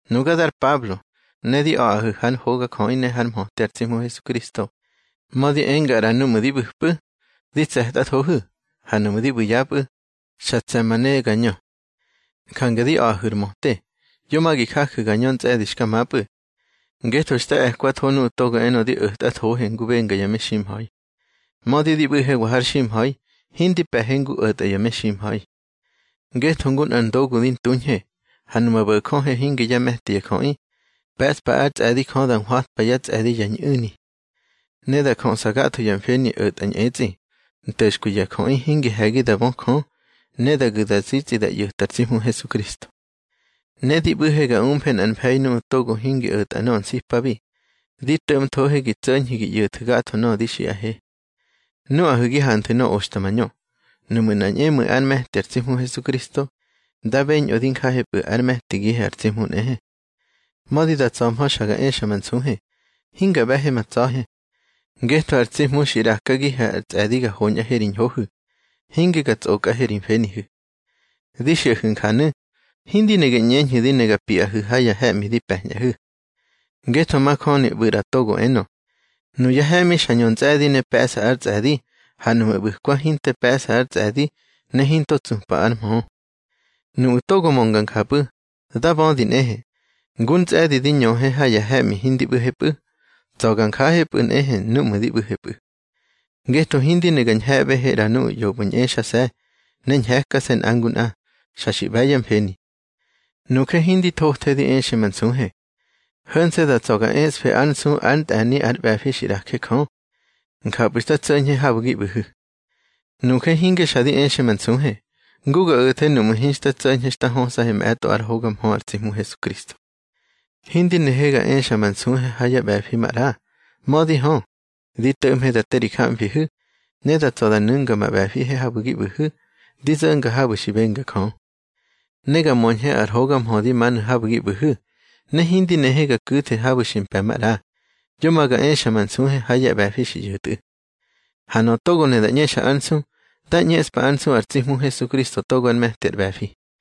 Nuga dar Pablo, ne di a̱ꞌahu̱ hár hogajöꞌi ne hár mhöte ar tsi Hmu Hesukristo, mödi enga ꞌra núꞌmu̱ di ꞌbu̱pꞌu̱, di tse̱tꞌathohu̱, ha núꞌmu̱ di ꞌbu̱ yapꞌu̱, xa tse̱ ma ne ga ñö. Jange di a̱ꞌahu̱ ar möte, yo ma gi jaju̱ ga ñö ntsꞌe̱di xka mapꞌu̱. Ngetho xta e̱kwatho nuꞌu̱ togo enö di o̱tꞌathohe ngu benga ya meximha̱i. Mödi di ꞌbu̱hewa har ximha̱i, hindi pe̱he ngu o̱tꞌa ya meximha̱i. Ngetho ngu nꞌar ndogu di ntuñhe. Ha numa bo̱jöhe hinge yá me̱ti ya jöꞌi, pe̱ꞌspa ár tsꞌe̱di Jö da hwatwa yá tsꞌe̱di ya ñꞌu̱ni. Ne da jöꞌsa gatho ya mfeni o̱tꞌa ñꞌetsꞌi, nto̱xkwi ya jöꞌi hingi he̱gi da bö Jö, ne da gu̱ da zitsꞌi da ꞌyo̱ta ar tsi Hmu Hesukristo. Ne di ꞌbu̱he ga umfe nꞌar mfe̱i nuꞌu̱ togo hingi o̱tꞌa nöꞌö nsipabi, di to̱ꞌmthohe gi tso̱ñhu̱ gi ꞌyo̱thu̱ gatho nöꞌö di xiꞌahe. Nuꞌahu̱ gi hanthu̱ nöꞌö oxta mañö. Nuꞌmu̱ nꞌa ñꞌemu̱i ár me̱ti ar tsi Hmu Hesukristo, dá beñꞌö di njahepꞌu̱, ár me̱tigihe ar tsi Hmu nꞌehe. Mödi da tsa̱hmö xa ga exa ma nsuhe, hinga ꞌbe̱he ma tsa̱he. Ngetho ar tsi Hmu xi ꞌrakagihe ar tsꞌe̱di ga hoñꞌahe ri ñhohu̱, hinge ga tsꞌokꞌahe ri mfenihu̱. Di xiꞌahu̱ njanu̱, hindi ne gi ꞌñeñhu̱ di ne ga piꞌahu̱ ha ya he̱ꞌmi di pe̱ñꞌahu̱. Ngetho majöni ꞌbu̱ ꞌra togo enö: Nuyá he̱ꞌmi xa ñö ntsꞌe̱di ne pe̱ꞌsa ar tsꞌe̱di, ha núꞌmu̱ ꞌbu̱kwa hinte pe̱ꞌsa ár tsꞌe̱di, ne hinto tsupa ár mhö. Nuꞌu̱ togo mönga njapꞌu̱, dá bödi nꞌehe, ngúr ntsꞌe̱di di ñöhe ha ya he̱ꞌmi hindi ꞌbu̱hepꞌu̱, tsa̱ ga njahepꞌu̱ nꞌehe núꞌmu̱ di ꞌbu̱hepꞌu̱. Ngetho hindi ne ga ñhe̱ꞌbehe ꞌra nuꞌu̱ ꞌyopꞌu̱ ñꞌexase̱, ne ñhe̱kse̱ nꞌa ngu nꞌa. Xa xi ꞌbe̱ yá mfeni. Nuje hindi thothe di exe ma nsuhe. Ho̱nse̱ da tsa̱ ga eꞌsfe ár nsu ár ntꞌe̱ni ar ꞌbe̱fi xi ꞌraje Jö. Njapꞌu̱ xta tso̱ñhe habu̱ gi ꞌbu̱hu̱. Nuje hinge xa di exe ma nsuhe, ngu ga o̱the nuꞌmu̱ hinxta tso̱ñhe xta hösꞌahe mꞌe̱tꞌo ár hoga mhö ar tsi Hmu Hesukristo. Hindi nehe ga exe ma nsuhe ha yá ꞌbe̱fi maꞌra. Mödi hö, di to̱ꞌmhe da te ri jamfihu̱, ne da tsa̱ da nu̱nga ma ꞌbe̱fihe habu̱ gi ꞌbu̱hu̱, di zo̱nga habu̱ xi benga Jö. Ne ga möñhe ar hoga mhö di manu̱ habu̱ gi ꞌbu̱hu̱. Ne hindi nehe ga ku̱the habu̱ xi mpe̱ maꞌra, yo ma ga exa ma nsuhe ha yá ꞌbe̱fi xi ꞌyo̱tꞌu̱. Ha nöꞌö togo ne da ꞌñexa ár nsu, dá ꞌñeꞌspa ár nsu ar tsi Hmu Hesukristo togo ár me̱ti ar ꞌbe̱fi.